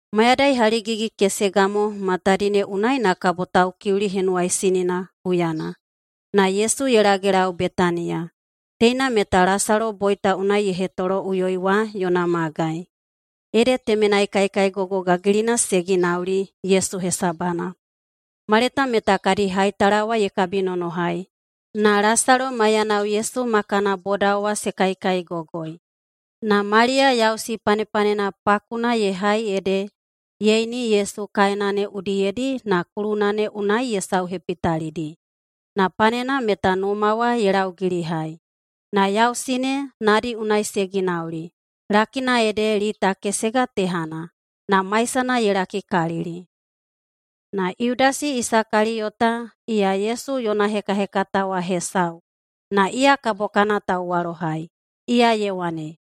Mayadai haligigi-kesega mo matadi ne unai na kabo Taukiuli Henuwaisinina huyana, na Yesu ye lagelau Betaniya, teina meta Lasalo boita unai ye hetoloꞌuyoi wa yona magai. Ede temenai kaikaigogo gagilina se ginauli Yesu hesabana. Maleta meta kadi haitala wa ye kabinonohai, na Lasalo maiyanao Yesu ma kana bodao wa se kaikaigogoi. Na Maliya yausi panepanena pakuna ye hai ede ye ini Yesu kaena ne udiyedi na kuluna ne unai ye sauhepitalidi, na panena meta numa wa ye laugilihai. Na yausi ne nadi unai se ginauli, lakina ede lita kesega tehana, na maisana ye lakikalili. Na Yudasi Isakaliyota, iya Yesu yona hekahekata wa hesau na iya kabo kana tauwalohai, iya ye wane,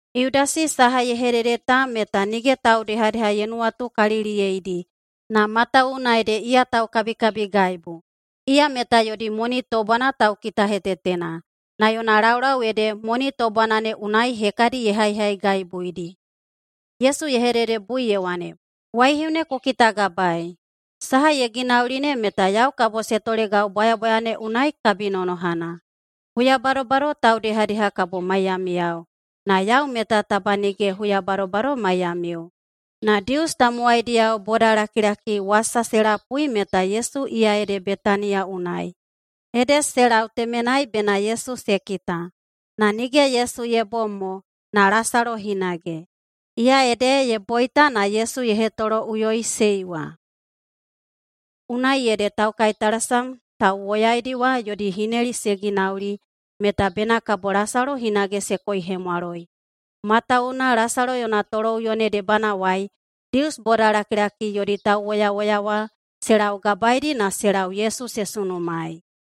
Yudasi saha ye hedede ta meta nige taudehadeha ye nuwatukaliliyeidi, na matawuwuna ede iya taukabikabigaibu. Iya meta yodi moni tobwana taukitahetetena, na yona laulau ede moni tobwana ne unai hekadi ye haihaigaibuidi. Yesu ye hededebui ye wane, “Waihiu ne ku kitagabaei! Saha ye ginauli ne meta yau kabo se tolegau bwayabwaya ne unai kabinonohana. Huya badobado taudehadeha kabo maiyamiyao, na yau meta taba nige huya badobado maiyamiu.” Na Dius tamowaidiyao bodalakilaki wasa se lapui meta Yesu iya ede Betaniya unai. Ede se lau temenai bena Yesu se kita, na nige Yesu ye bom mo, na Lasalo hinage, iya ede ye boita na Yesu ye hetoloꞌuyoiꞌusei wa. Unai ede taukaitalasam tauwoyaidi wa yodi hineli se ginauli meta bena kabo Lasalo hinage se koihemwaloi. Matawuwuna Lasalo yona toloꞌuyo ne debanawai, Dius bodalakilaki yodi tauwoyawoya wa se laugabaedi na se lau Yesu se sunumaei.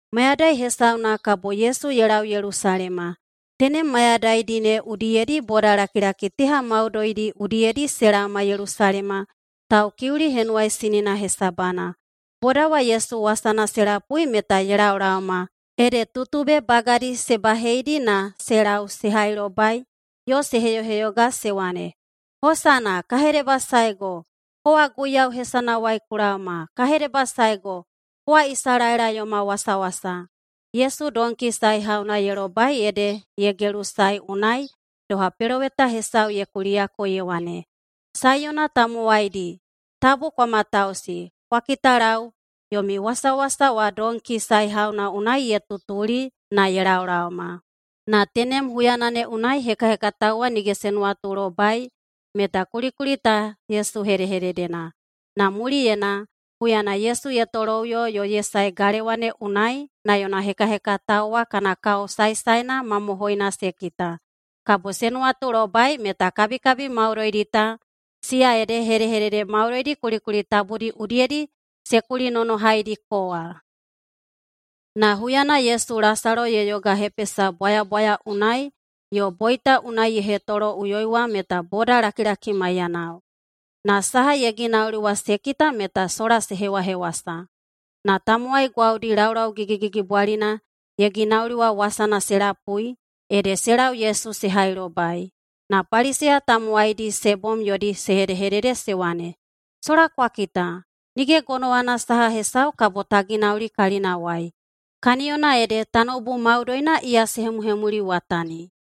Mayadai hesauna kabo Yesu ye lau Yelusalema. Tenem mayadaidi ne udiyedi bodalakilaki teha maudoidi udiyedi se laoma Yelusalema Taukiuli Henuwaisinina hesabana. Boda wa Yesu wasana se lapui meta ye laolaoma ede tutube bagadi se baheidi na se lau se hailobai yo se heyoheyoga se wane, “Hosana!” “Ka hedebasaego, kowa Guiyau hesanawai ku laoma.” “Ka hedebasaego, kowa Isalaela yoma wasawasa.” Yesu donki saehauna ye lobai ede ye gelusae unai, doha peloweta hesau ye kuliyako ye wane, “Saiyona tamowaidi, tabu kwa matausi! Kwa kitalau! Yomi wasawasa wa donki saehauna unai ye tutuli na ye laolaoma.” Na tenem huyana ne unai hekahekatao wa nige se nuwatulobai meta kulikuli ta Yesu hedehededena. Na muliyena, huyana Yesu ye toloꞌuyo yo ye sae galewa ne unai na yona hekahekatao wa kana kao saesaena mamohoina se kita, kabo se nuwatulobai meta kabikabi maudoidi ta siya ede hedehedede maudoidi kulikuli tabudi udiyedi se kulinonohaidiko wa. Na huyana Yesu Lasalo ye yogahepesa bwayabwaya unai yo boita unai ye hetoloꞌuyoi wa meta bodalakilaki maiyanao. Na saha ye ginauli wa se kita meta sola se hewahewasa. Na tamowai gwaudi laulau gigigigibwalina ye ginauli wa wasana se lapui, ede se lau Yesu se hailobai. Na Paliseya tamowaidi se bom yodi se hedehedede se wane, “Sola kwa kita! Nige gonowana saha hesau kabo ta ginauli kalinawai. Kaniyona ede tanoubu maudoina iya se hemuhemuliwatani.”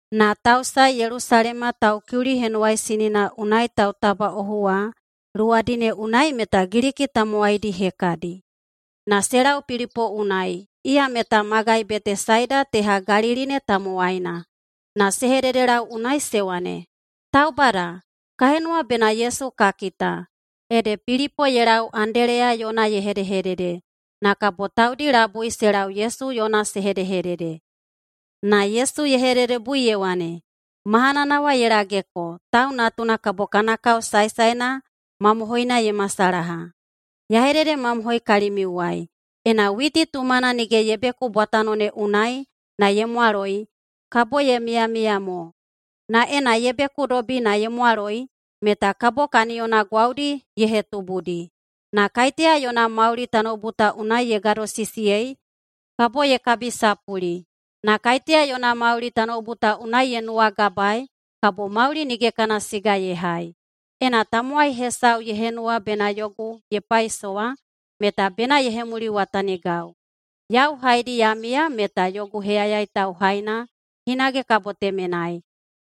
Na tausae Yelusalema Taukiuli Henuwaisinina unai tautabaꞌohu wa luwadi ne unai meta Giliki tamowaidi hekadi. Na se lau Pilipo unai, iya meta magai Betesaida teha Galili ne tamowaina, na se hededelau unai se wane, “Taubada, ka henuwa bena Yesu ka kita.” Ede Pilipo ye lau Andeleya yona ye hedehedede, na kabo taudi labui se lau Yesu yona se hedehedede. Na Yesu ye hededebui ye wane, “Mahanana wa ye lageko, Tau Natuna kabo kana kao saesaena mamohoina ye masalaha. Ya hededemamohoi kalimiuwai: Ena witi tumana nige ye beku bwatano ne unai na ye mwaloi, kabo ye miyamiya mo. Na ena ye bekudobi na ye mwaloi, meta kabo kaniyona gwaudi ye hetubudi. Na kaiteya yona mauli tanoubu ta unai ye gadosisiyei, kabo ye kabisapuli. Na kaiteya yona mauli tanoubu ta unai ye nuwagabaei, kabo mauli nige kana siga ye hai. Ena tamowai hesau ye henuwa bena yogu ye paisowa, meta bena ye hemuliwatanigau. Yau haedi ya miya meta yogu heyayai tauhaina hinage kabo temenai.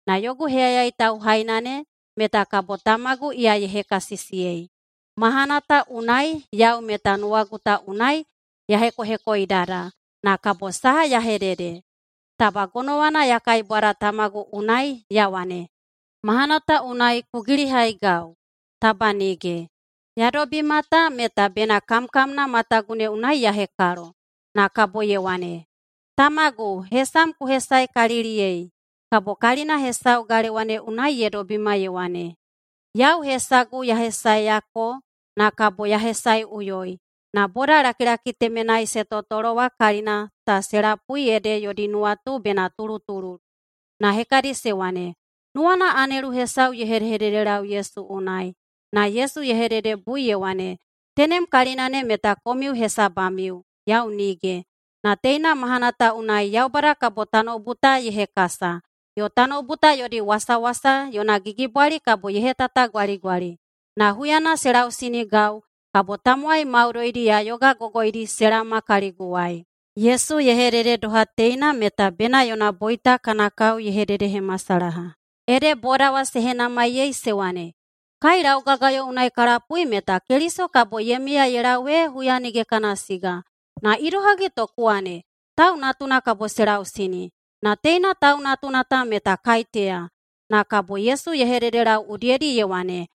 Na yogu heyayai tauhaina ne meta kabo Tamagu iya ye hekasisiyei. Mahana ta unai yau meta nuwagu ta unai ya hekohekoidada, na kabo saha ya hedede? Taba gonowana ya kaibwada Tamagu unai ya wane, ‘Mahana ta unai ku gilihaigau’? Taba nige! Ya dobima ta meta bena kamkamna matagu ne unai ya hekalo.” [Na kabo ye wane], “Tamagu, hesam ku hesaekaliliyei.” Kabo kalina hesau galewa ne unai ye dobima ye wane, “Yau hesagu ya hesaeyako na kabo ya hesaeꞌuyoi.” Na bodalakilaki temenai se totolo wa kalina ta se lapui ede yodi nuwatu bena tulutululu. Na hekadi se wane, “Nuwana anelu hesau ye hedehededelau Yesu unai.” Na Yesu ye hededebui ye wane, “Tenem kalina ne meta komiu hesabamiu, yau nige. Na teina mahana ta unai Yaubada kabo tanoubu ta ye hekasa, yo tanoubu ta yodi wasawasa yona gigibwali kabo ye hetatagwaligwali. Na huyana se lausinigau, kabo tamowai maudoidi ya yogagogoidi se laoma kaliguwai.” Yesu ye hedede doha teina meta bena yona boita kana kao ye hededehemasalaha. Ede boda wa se henamaiyei se wane, “Kai laugagayo unai ka lapui meta Keliso kabo ye miya ye lau ee huya nige kana siga. Na idohagi to ku wane, ‘Tau Natuna kabo se lausini’? Na teina Tau Natuna ta meta kaiteya?” Na kabo Yesu ye hededelau udiyedi ye wane,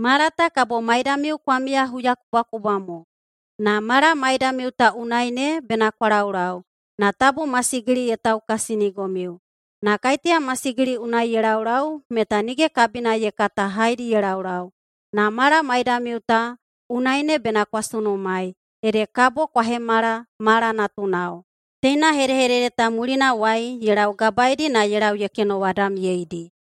“Mala ta kabo maidamiu kwa miya huyakubwakubwa mo. Na mala maidamiu ta unai ne bena kwa laulau, na tabu masigili ye taukasinigomiu. Na kaiteya masigili unai ye laulau meta nige kabina ye kata haedi ye laulau. Na mala maidamiu ta unai ne bena kwa sunumaei, ede kabo kwa hemala mala natunao.” Teina hedehedede ta mulinawai ye laugabaeidi na ye lau ye kenowadamyeidi.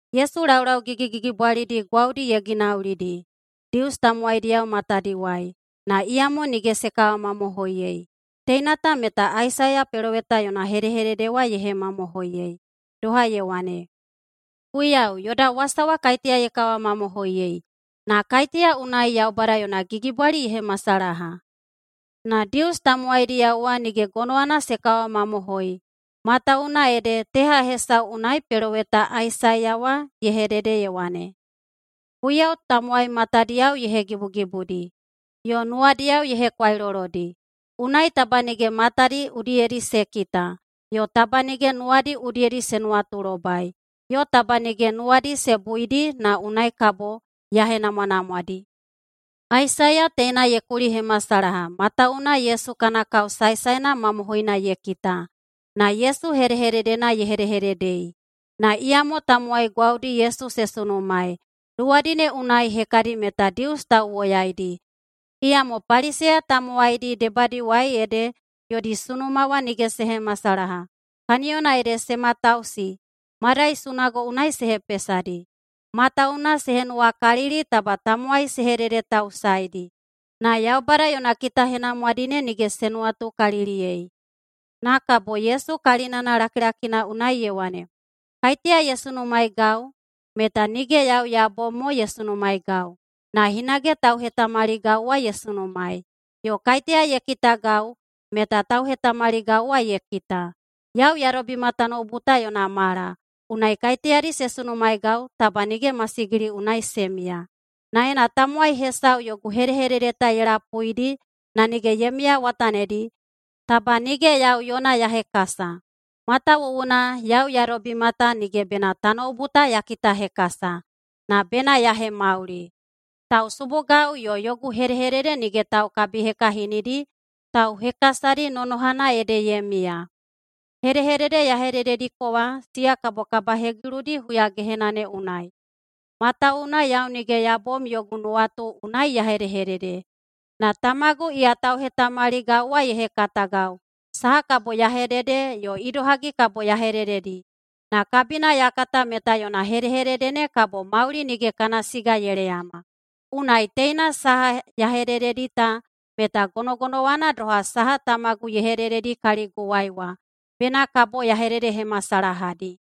Yesu laulau gigigigibwalidi gwaudi ye ginaulidi Dius tamowaidiyao matadiwai, na iyamo nige se kawamamohoiyei. Teina ta meta Aisaiya peloweta yona hedehedede wa ye hemamohoiyei, doha ye wane, “Guiyau, yoda wasa wa kaiteya ye kawamamohoiyei? Na kaiteya unai Yaubada yona gigibwali ye hemasalaha?” Na Dius tamowaidiyao wa nige gonowana se kawamamohoi, matawuwuna ede teha hesau unai peloweta Aisaiya wa ye hedede ye wane, “Guiyau tamowai matadiyao ye hegibugibudi, yo nuwadiyao ye hekwailolodi, unai taba nige matadi udiyedi se kita, yo taba nige nuwadi udiyedi se nuwatulobai, yo taba nige nuwadi se buidi na unai kabo ya henamwanamwadi.” Aisaiya teina ye kulihemasalaha, matawuwuna Yesu kana kao saesaena mamohoina ye kita, na Yesu hedehededena ye hedehededei. Na iyamo tamowai gwaudi Yesu se sunumaei, luwadi ne unai hekadi meta Dius tauwoyaidi. Iyamo Paliseya tamowaidi debadiwai ede yodi sunuma wa nige se hemasalaha, kaniyona ede se matausi madai sunago unai se hepesadi. Matawuwuna se henuwakalili taba tamowai se hededetausaeidi, na Yaubada yona kitahenamwadi ne nige se nuwatukaliliyei. Na kabo Yesu kalinana lakilakina unai ye wane, “Kaiteya ye sunumaeigau, meta nige yau ya bom mo ye sunumaeigau, na hinage tauhetamaligau wa ye sunumaei. Yo kaiteya ye kitagau, meta tauhetamaligau wa ye kita. Yau ya dobima tanoubu ta yona mala, unai kaiteyadi se sunumaeigau taba nige masigili unai se miya. Na ena tamowai hesau yogu hedehedede ta ye lapuidi na nige ye miyawatanidi, taba nige yau yona ya hekasa. Matawuwuna yau ya dobima ta nige bena tanoubu ta ya kitahekasa, na bena ya hemauli. Tausubugau yo yogu hedehedede nige taukabihekahinidi, tauhekasadi nonohana ede ye miya. Hedehedede ya hededediko wa, siya kabo kabahegiludi huyagehena ne unai. Matawuwuna yau nige ya bom yogu nuwatu unai ya hedehedede, na Tamagu iya tauhetamaligau wa ye hekatagau saha kabo ya hedede yo idohagi kabo ya hedededi. Na kabina ya kata meta yona hedehedede ne kabo mauli nige kana siga ye leyama. Unai teina saha ya hedededi ta meta gonogonowana doha saha Tamagu ye hedededi kaliguwai wa bena kabo ya hededehemasalahadi.”